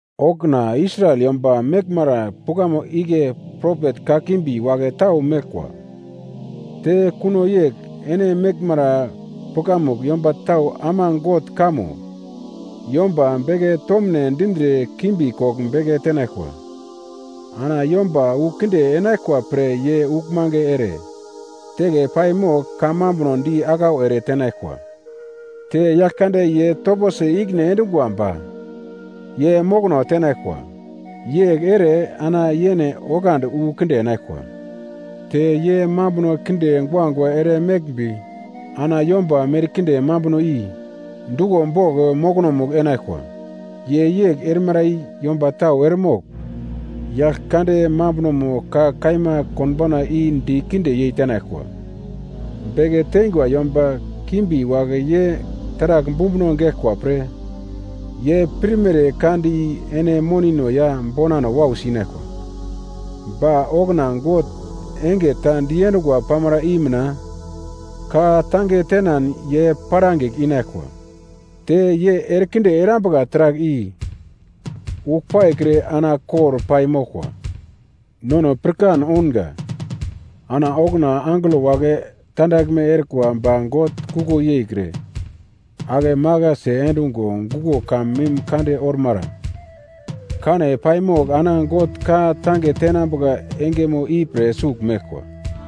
Okuna Israel yomba meglmara pukamugl igle propet kakimbi wagle tau meglkwa. Te kuno yegl ene meglmara pukamugl yomba tau ama God kamo yomba beke tomune dindre kimbi kogl beke tenaglkwa. Ana yomba wu kinde enaglkwa pre ye uglmange ere teke pai mogl kamambuno di aglau ere tenaglkwa. Te Yaglkande ye toposi ikine endungwa ba ye mokono tenaglkwa. Yegl ere ana yene oglandi wu kinde enaglkwa. Te ye mambuno kinde guagua ere meglmbi ana yomba merkinde mambuno i duglo bogl mokonomugl enaglkwa. Ye yegl erimara i yomba tau eremogl Yaglkande mambunomo ka kaima konbauna i dikinde yeitenaglkwa. Beke teingwa yomba kimbi wagle ye taragl bumbuno geglkwa pre ye pirmere ka di ene monino ya bonano wausi inaglkwa. Ba okuna God enge ta diendungwa pamara i mina ka-tange tenan ye perangigl inaglkwa. Te ye erekinde erambuka taragl i uglpaikre ana kor pai moglkwa. Nono pirkan ounga, ana okuna angelo wagle tandaglme erikwa ba God kuko yeikre, akemaglasi endungo guglo kamun mim kande ormara kane paimogl ana God ka-tange tenambuka engemo ipre sugl meglkwa.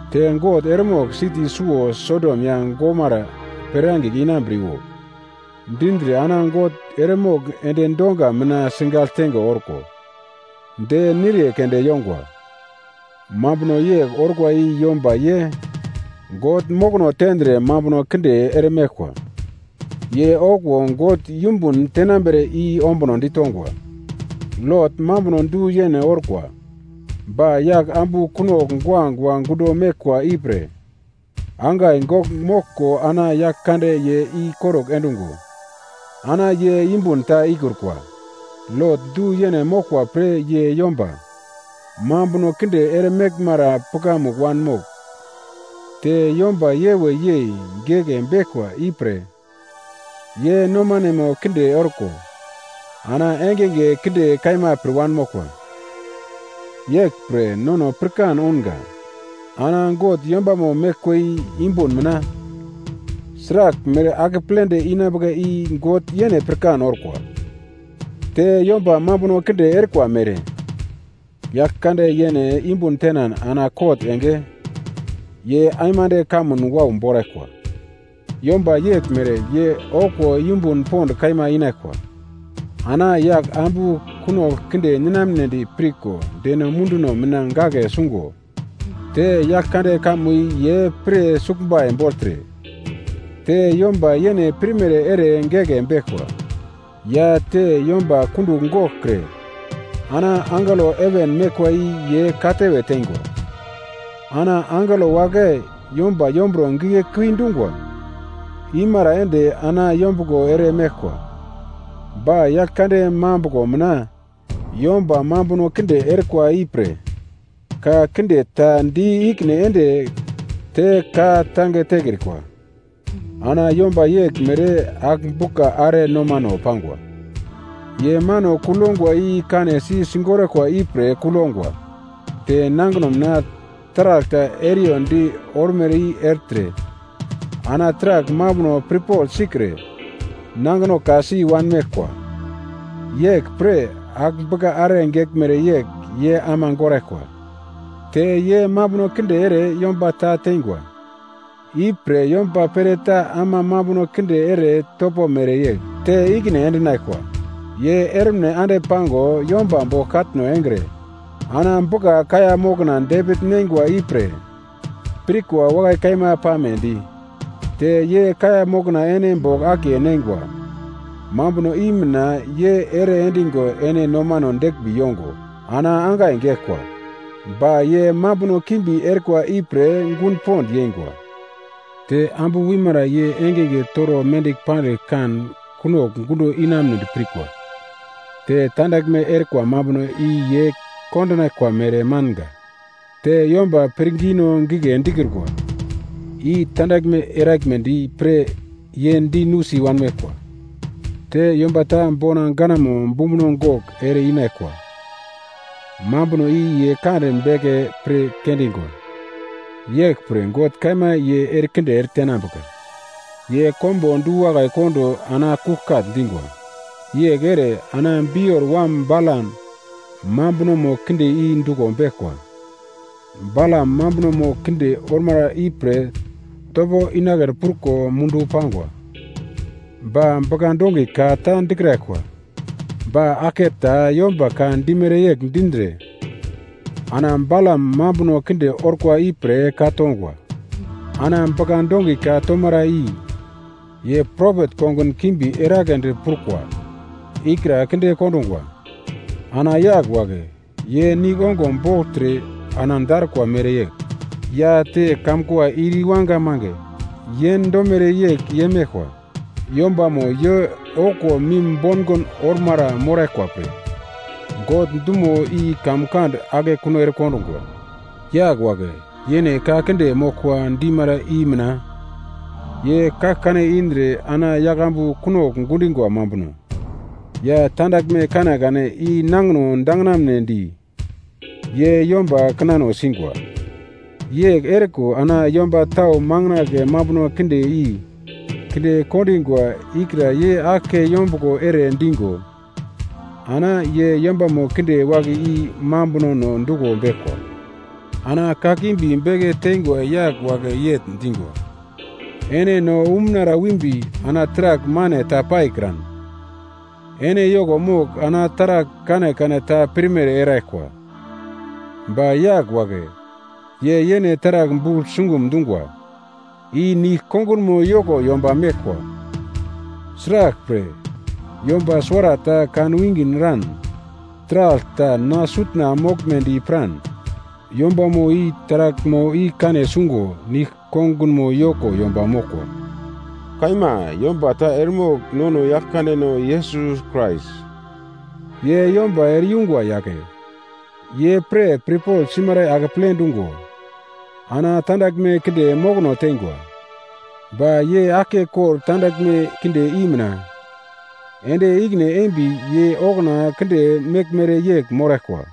Te God eremogl siti suwo Sodom ya Gomara perangigl inambriwo dindre ana God eremogl endi donga mina sigagl tenge orko de niriye keunde yongwa. Mambuno yegl orkwa i yomba ye God mokono tendre mambuno kinde eremeglkwa, ye okuwo God yumbun tenambere i ombuno ditongwa. Lot mambuno du-yene orkwa ba yagl ambu kunogl guagua gundo meglkwa ipre angai gogl moglko ana Yaglkande ye ikorugl endungo ana ye yumbun ta ikrukwa. Lot du-yene moglkwa pre ye yomba mambuno kinde ere meglmara pukamugl wanmogl, te yomba yewe yei geke beglkwa ipre ye nomanemo kinde orko, ana engenge kinde kaima pir wanmoglkwa. Yeglpre nono pirkan ounga, ana God yombamo meglkwa i yumbun mina sraglmere akepledi inambuka i God yene pirkan orkwa. Te yomba mambuno kinde erikwa mere Yaglkande yene yumbun tenan ana kot enge ye aimande kamun wau boraglkwa. Yomba yeglmere ye okuwo yumbun pond kaima inaglkwa. Ana Yaglambu kunogl kinde ninamnedi pirko deno munduno mina gagle sungo, te Yaglkande kamo i ye pir suglbai bogltre, te yomba yene pirmere ere geke beglkwa, ya te yomba kundugl goglkre ana angelo heven meglkwa i ye katewe teingwa. Ana angelo wagle yomba yomburo gigle kuidi dungwa imara ende ana yombuglo ere meglkwa, ba Yaglkande mambuglo mina yomba mambuno kinde erikwa ipre ka kinde ta di ikine ende te ka tange tekrikwa. Ana yomba yeglmere agl-bugla are nomano pangwa, ye mano kugl yongwa i kanesi sigoraglkwa ipre kugl yongwa. Te nangino mina taragl ta eriyondi ormere i ertre ana taragl mambuno pirpogl sikre nangino ka-si wanmeglkwa. Yeglpre agl-bugla are geglmere yegl ye ama goraglkwa. Te ye mambuno kinde ere yomba ta teingwa, ipre yomba pereta ama mambuno kinde ere topo mereyegl te ikine endinaglkwa. Ye ermine ande pango yomba bogl katno engre ana bugla-kaiya mokna depigl neingwa ipre pirkwa wakai kaima pamedi. Te ye kaiya mokna ene bogl akiye neingwa mambuno i mina ye ere endigo ene nomano deglmbi yongo ana angai geglkwa. Ba ye mambuno kimbi erikwa ipre gun pond yeingwa. Te ambu wimara ye engenge toro mendigl pandigl kan kunogl gundo inamunedi pirkwa. Te tandaglme erikwa mambuno i ye kondinaglkwa mere manga. Te yomba pirngino gigle dikrukwa, i tandaglme eraglmedi pre ye di nusi wanmeglkwa. Te yomba ta bona ganamo bumbuno gogl ere-inaglkwa mambuno i ye kande beke pir kendingwa. Yeglpre God kaima ye erekinde eretenambuka. Ye konbo du-wakai kondo ana kuglkagl dingwa. Yegl ere ana Bior wam Balam mambunomo kinde i duglo beglkwa. Balam mambunomo kinde ormara ipre topo inagledi pruko mundu pangwa. Ba bugla-dongi ka ta dikraglkwa, ba aglke ta yomba ka dimere yegl dindre ana Balam mambuno kinde orkwa ipre ka-tongwa. Ana bugla-dongi ka tomara i ye propet kongun kimbi eragledi prukwa ikra kinde kondungwa. Ana yagl wagle ye nigl ongo bogltre ana darukwa mereyegl, ya te kamkua ir iwanga mange yendomere yegl ye meglkwa. Yombamo ye okuwo mim bongond ormara moraglkwa pre God dumo i kamkand akekun erekondungwa. Yagl wagle yene ka kinde moglkwa dimara i mina ye kaglkane indre ana yaglambu kunogl gundingwa mambuno ya tandaglme kanekane i nangino danginaglmedi ye yomba kinano singwa: Yegl eriko ana yomba tau makandle mambuno kinde i kinde kondingwa ikra ye aglke yombuglo ere digo ana ye yombamo kinde wagle i mambunono duglo beglkwa. Ana kakimbi beke teingwa yagl wagle yegl dingwa, “Ene no umunara wimbi ana taragl mane ta paikran ene yoko mogl ana taragl kanekane ta pirmere eraglkwa.” Ba yagl wagle ye yene taragl bugl sungum dungwa i nigl-kongunmo yoko yomba meglkwa, sraglpre, yomba suwarata kanwinge eran taragl ta na sutna moglmedi piran yombamo i taraglmo i kane sungo nigl-kongunmo yoko yomba moglkwa. Kaima, yomba ta eremogl nono Yaglkandeno Yesus Krais, ye yomba ere yungwa yagle, ye pre pirpogl simara i akeple dungo ana tandaglme kinde mokono teingwa. Ba ye aglke kordagl tandaglme kinde i mina ende ikine embi ye okuna kinde meglmere yegl moglkraglkwa,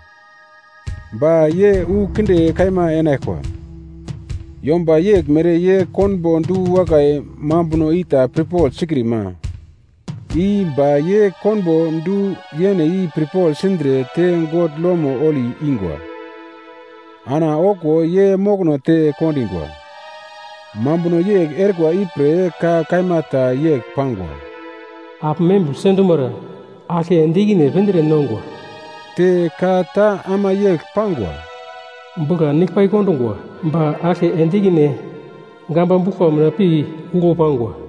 ba ye wu kinde kaima enaglkwa. Yomba yeglmere ye konbo du-wakai mambuno ita pirpogl sikrima i, ba ye konbo du-yene i pirpogl sindre te God lomo holi ingwa. Ana okuwo ye mokono te kondingwa. Mambuno yegl erikwa ipre ka kaima ta yegl pangwa: “Agl membigl sendumara aglke ende ikine pindre nongwa.” Te ka ta ama yegl pangwa, “Bugla nigl pai kondungwa, ba aglke ende ikine gamba buglkwa mina pi uglu pangwa.”